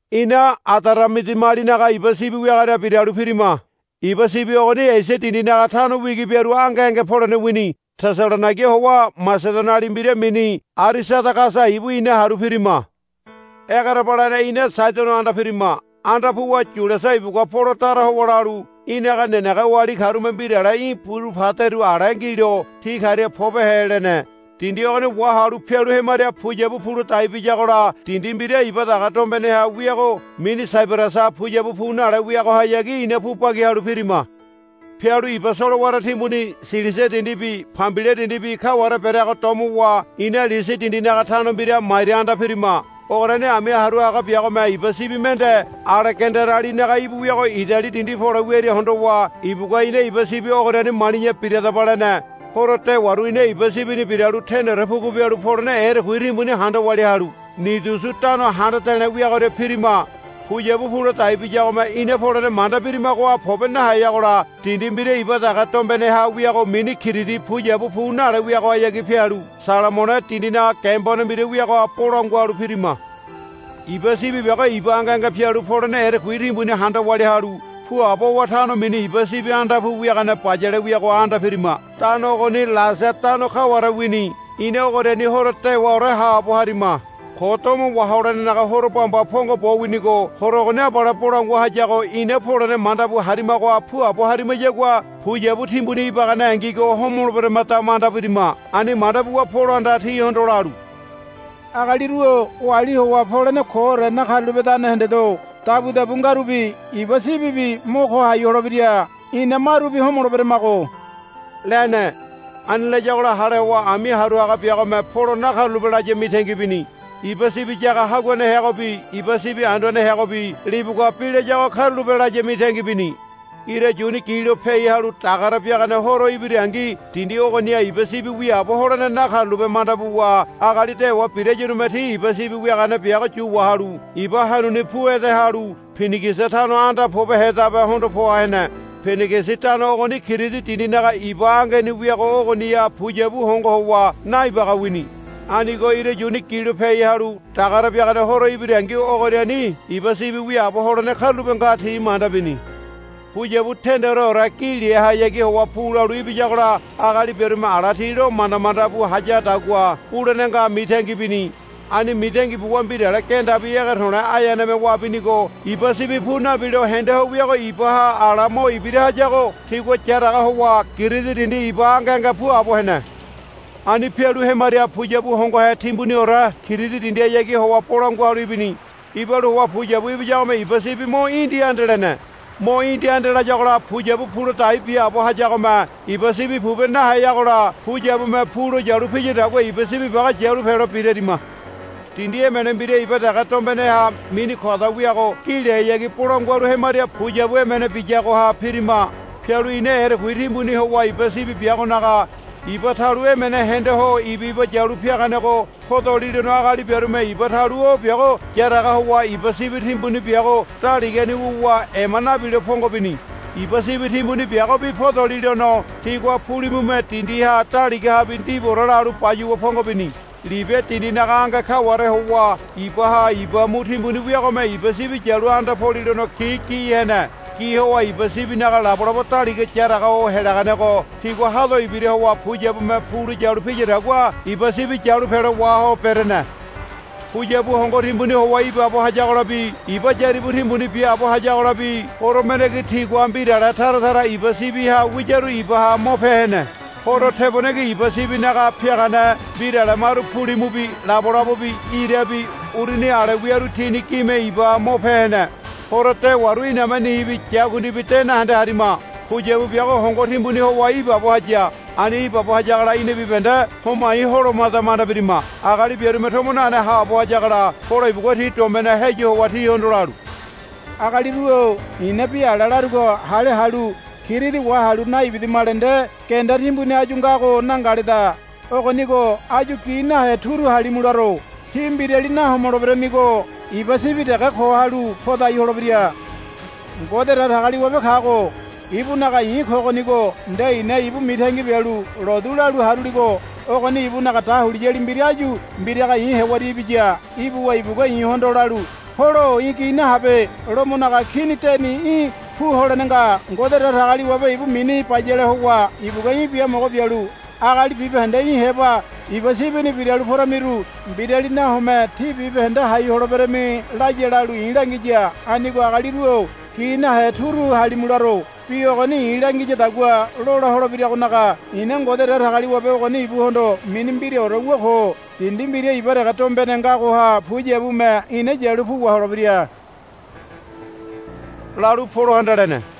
Ina Adaramidiamalinaga iba sibi wiagoria biralu pirima. Iba sibi ogoni Esia dindinaga tano wigi biaru ange ange polene wini. Tesalonaiga howa Masedoniali mbira mini Arisadagasa ibu ina haru pirima. Egerebalene ina Saidono anda pirima. Anda puwa Yuliasa ibugua Polo dara howa lalu, Í̠naga nenege oali karume mbirale í̠ buru paderu ale ngilo ti karia pobehe, lene. Dindi ogoni wahalu pialu hemaria puyabu pu ladai biyagola dindi mbira iba dege dombeneha wiago mini Saibarasa puyabu pu nale wiagohayagi ina pu bagi halu pirima. Pialu iba solowara timbuni Silisia dindibi Pambilia dindibi kaware bereago domowa ina Lisia dindinaga tano mbira Maira anda pirima. Ogoriani ami haru haga biagome iba sibi mende Alegandarialinaga íbu wiago Idali dindi pole wiaria hondowa ibugua ina iba sibi ogoriani mali̱ya biradaba, lene. Horo dewaru ina iba sibini biralu tendeore pugu bialu polene erekui timbuni handa walia halu Nidusu tano handa de̱le̱ wiagoria pirima. Puyabu pu ladai biyagome ina polene manda birimagoha pobe naheyagola dindi mbira iba dege dombeneha wiago mini Kiridi puyabu pu nale wiagohayagi pialu Salamone dindinaga gembone mbira wiago bolangua halu pirima. Iba sibi biago iba ange ange pialu polene erekui timbuni handa walia halu puabo howa tano mini Iba Sibi Anda Pu Wiagane Bayale wiagoha anda pirima. Tano ogoni Lasea tano kaware wini. Ina ogoriani horo dewaore haabo harima. Ko Domo Waholenenaga Horo bamba pongo bo winigo horo ogoni abale bolangua hayago ina polene manda bu harimagoha puabo harimayagua puyabu timbuni ibaganengigo homoleberemada manda birima. Ani manda buwa Polohanda tihondo lalu, Agaliru-o oali howa polene koore nakarulapedane hendedo. Dabudabu ngarubi iba sibibi mo ko hai holebira. Ina marubi homoleberamago, lene. Ani layagola hale howa ami haru haga biagome Polo nakarulape laya mitangi bini. Iba sibi yaga haguane heagobi iba sibi anduane heagobi libugua bi layago karulape laya mitangi bini. Ira yuni gilo piai halu dagare biagane horo ibirangi dindi ogoniha iba sibi wiaabo holene nakarulape manda buwa agali dewa birayarume ti iba sibi wiagane biago yu wahalu iba hanuni pu ede halu Pinigisi tano anda pobehedabe hondo poa hene. Pinigisi tano ogoni Kiridi dindinaga iba angeni wiago ogoniha puyabu hongo howa naibaga wini. Anigo ira yuni gilo piai halu dagare biagane horo ibirangi ogoriani iba sibi wiaabo holene karulape nga ti manda bini. Puyabu tendeore gi lehayagi howa pu lalu ibiyagola agali biarume ala ti lo manda manda bu hayadagua bulene nga mitangi bini. Ani mitangi buwa mbirale gendabi ege to̱le̱ aeaneme wabinigo iba sibi pu nabilo hende ho wiago ibaha ala mo ibira hayago tigua yaraga howa Kiridi dindi iba ange ange puabo hene. Ani pialu hemaria puyabu hongohe timbuniore Kiridi dindihayagi howa bolangua halu ibini. Ibalu howa puyabu ibiyagome iba sibi mo indi ande lene. Mo indi ande layagola puyabu pu ladai biaabo hayagome iba sibi pobe naheyagola puyabume pu lo yu piyadagua iba sibi biago yalu pelo birarima. Dindi emene mbira iba dege dombeneha mini Koda wiago gi lehayagi bolangua halu hemaria puyabu emene biyagoha pirima. Pialu ina erekui timbuni howa iba sibi biagonaga iba talu emene hende ho iba iba yalu piaganego podolilono agali biarume iba talu o biago yaraga howa iba sibi timbuni biago daligani wuwa ema nabilo pongo bini. Iba sibi timbuni biagobi podolilono tigua pulimume dindiha daligahabi ndibuore lalu bayuwa pongo bini. Libia dindinaga ange kaware howa ibaha iba mu timbuni wiagome iba sibi yalu anda polilono ti gi hene. Gi howa iba sibinaga labolabo daliga yaraga ho helaganego tigua hado ibira howa puyabume pu lalu piyadagua iba sibi yalu pelo waho berene. Puyabu hongo timbuni howa ibaabo hayagolabi iba yaribu timbuni biaabo hayagolabi horo mendengi tigua mbirale tara tara iba sibiha wiyaru ibaha mo pe hene. Horo tebonengi iba sibinaga piagane mbirale maru pulimubi labolabobi irabi uruni ale wiaru tini gime ibaha mo pe hene. Horo dewaru iname nibi yakundibi de nahende harima. Puyabu biago hongo timbuni howa ibaabo haya. Ani ibaabo hayagola ina bibahende homai holomada manda birima. Agali biarume tomo nane haabo hayagola Polo ibugua ti dombeneha heyu howa tihondo lalu, Agaliru-o i̱na bi ala larugo hale halu Kiridi wahalu naibidamale nde genda timbuni áyu ngago nangaleda. Ogonigo áyu gi nahe turu halimu laro. Tí mbirali nahomoleberamigo iba sibi dege ko halu podai holebira. Ngode Datagaliwabe kago ibunaga i̱ kogonigo nde i̱na ibu mitangi bialu lotu lalu haruligo ogoni ibunaga dahuliyali mbira áyu mbiraga i̱ hewaria ibiya. Ibuwa ibugua i̱hondo lalu, Polo-o í̠ gi nahabe. Lomonaga Kini deni í̠ pu holene nga. Ngode Datagaliwabe ibu mini bayale howa ibugua í̠ biamogo bialu agali bibahende í̠ heba iba sibini biralu poramiru mbirali nahome tí bibahende hai holeberami, laya lalu i̱ langiya. Anigo agaliru-o gi nahe turu halimu laro. Bi ogoni i̱ langiyadagua lola holebiragonaga i̱na Ngode Datagaliwabe ogoni ibuhondo mini mbiraore wu ko. Dindi mbira iba dege dombene ngagoha puyabume ina yalu pu waholebira, lalu Polohanda lene.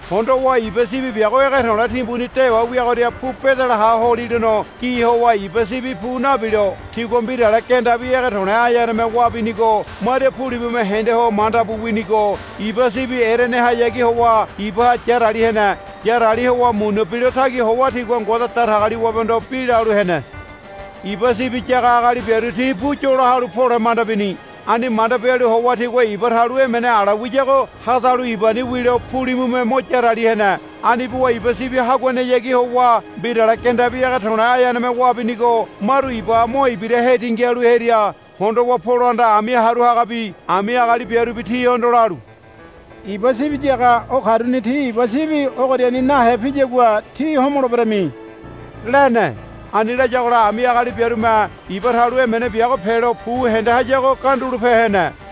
Hondowa iba sibi biago ege to̱le̱ timbuni dewa wiagoria pu bedelaha holilono gi howa iba sibi pu nabilo tigua mbirale gendabi ege to̱le̱ aeaneme wabinigo maria pulimume hende ho manda bu winigo iba sibi erenehayagi howa ibaha yarali hene. Yarali howa muna bilotagi howa tigua Ngode Datagaliwabehondo bi lalu hene. Iba sibi yaga agali biaru ti pu yola halu pole manda bini. Ani manda bialu howa tigua iba talu emene ala wiyago hadalu ibani wilo pulimume mo yarali hene. Ani buwa iba sibi haguanehayagi howa mbirale gendabi ege to̱le̱ aeaneme wabinigo maru ibaha mo ibira hetingi halu hearia hondowa Polohanda ami haru hagabi ami agali biarubi tihondo lalu, Iba sibi yaga o karuni ti iba sibi ogoriani nahe piyagua tí homoleberami, lene. Ani layagola ami agali biarume iba talu emene biago pelo pu hende hayago gandulope hene.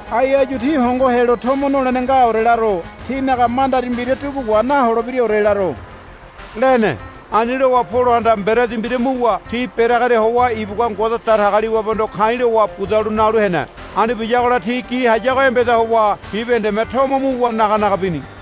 ai áyu tí hongo helo tomo nolene ngaore laro. Tínaga mandari mbira dugu wa naholebiraore laro, lene. Ani lowa Polohanda mberedi mbira muwa ti bereagoria howa ibugua Ngode Datagaliwabehondo ka̱i̱ lowa budalu nalu hene. Ani biyagola ti gi hayago embeda howa bibahendeme tomo muwa naga naga bini.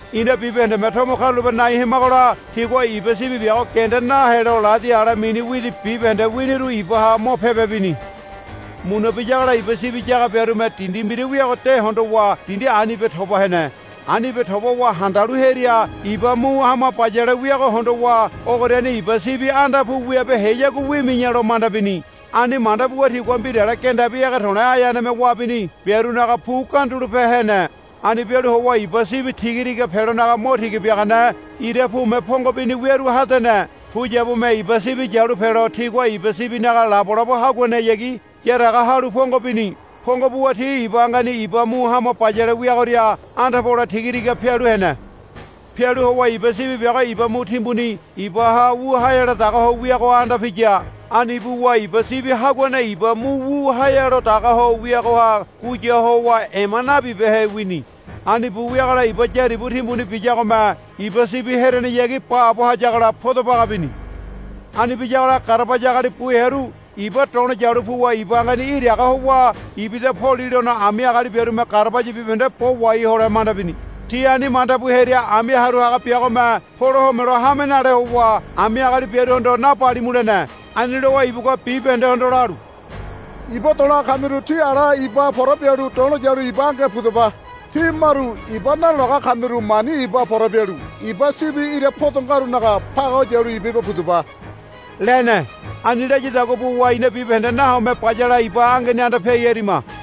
Ina bibahendeme tomo karulape nai hemagola tigua iba sibi biago genda nahelo ladi ale mini widi bibahende winiru ibaha mo pebe bini. Muna biyagola iba sibi yaga biarume dindi mbira wiago de hondowa dindi anibe toba hene. Anibe toba howa handalu hearia iba mu hama bayale wiago hondowa ogoriani iba sibi anda pu wibeheyagua wimi̱ya lo manda bini. Ani manda buwa tigua mbirale gendabi ege to̱le̱ aeaneme wabini biarunaga pu gandulope hene. Ani bialu howa iba sibi tiga tiga pelonaga mo tiga biagane ira pume pongo bini wiaru hadene. Puyabume iba sibi yalu pelo tigua iba sibinaga labolabo haguanehayagi yaraga halu pongo bini. Pongo buwa ti iba angeni iba mu hama bayale wiagoria anda pole tiga tiga pialu hene. Pialu howa iba sibi biago iba mu timbuni ibaha wu haealo dagaho wiagoha anda piya. Ani buwa iba sibi haguane iba mu wu haealo dagaho wiagoha guya howa ema nabibehe wini. Ani bu wiagola iba yaribu timbuni biyagome iba sibi herenehayagi baabo hayagola podo baga bini. Ani biyagola garabaya agali bu hearu iba do̱lo yalu puwa iba angeni iraga howa ibida polilono ami agali biarume garabaya bibahende bo wahai hole lo manda bini. Ti ani manda bu hearia ami haru haga biagome Polo homelo hame nale howa ami agali biaruhondo, Nabalimu, lene. Ani lowa ibugua bibahendehondo lalu, Iba do̱laga kamiru tí ala ibaha pora bialu do̱lo yalu iba angeha pudaba. Tí maru iba nado̱laga kamiru mani ibaha pora bialu iba sibi ira podo ngarunaga pagaho yalu iba iba pudaba, lene. Ani layadagua buwa ina bibahende nahome bayale iba angeni anda piai harima.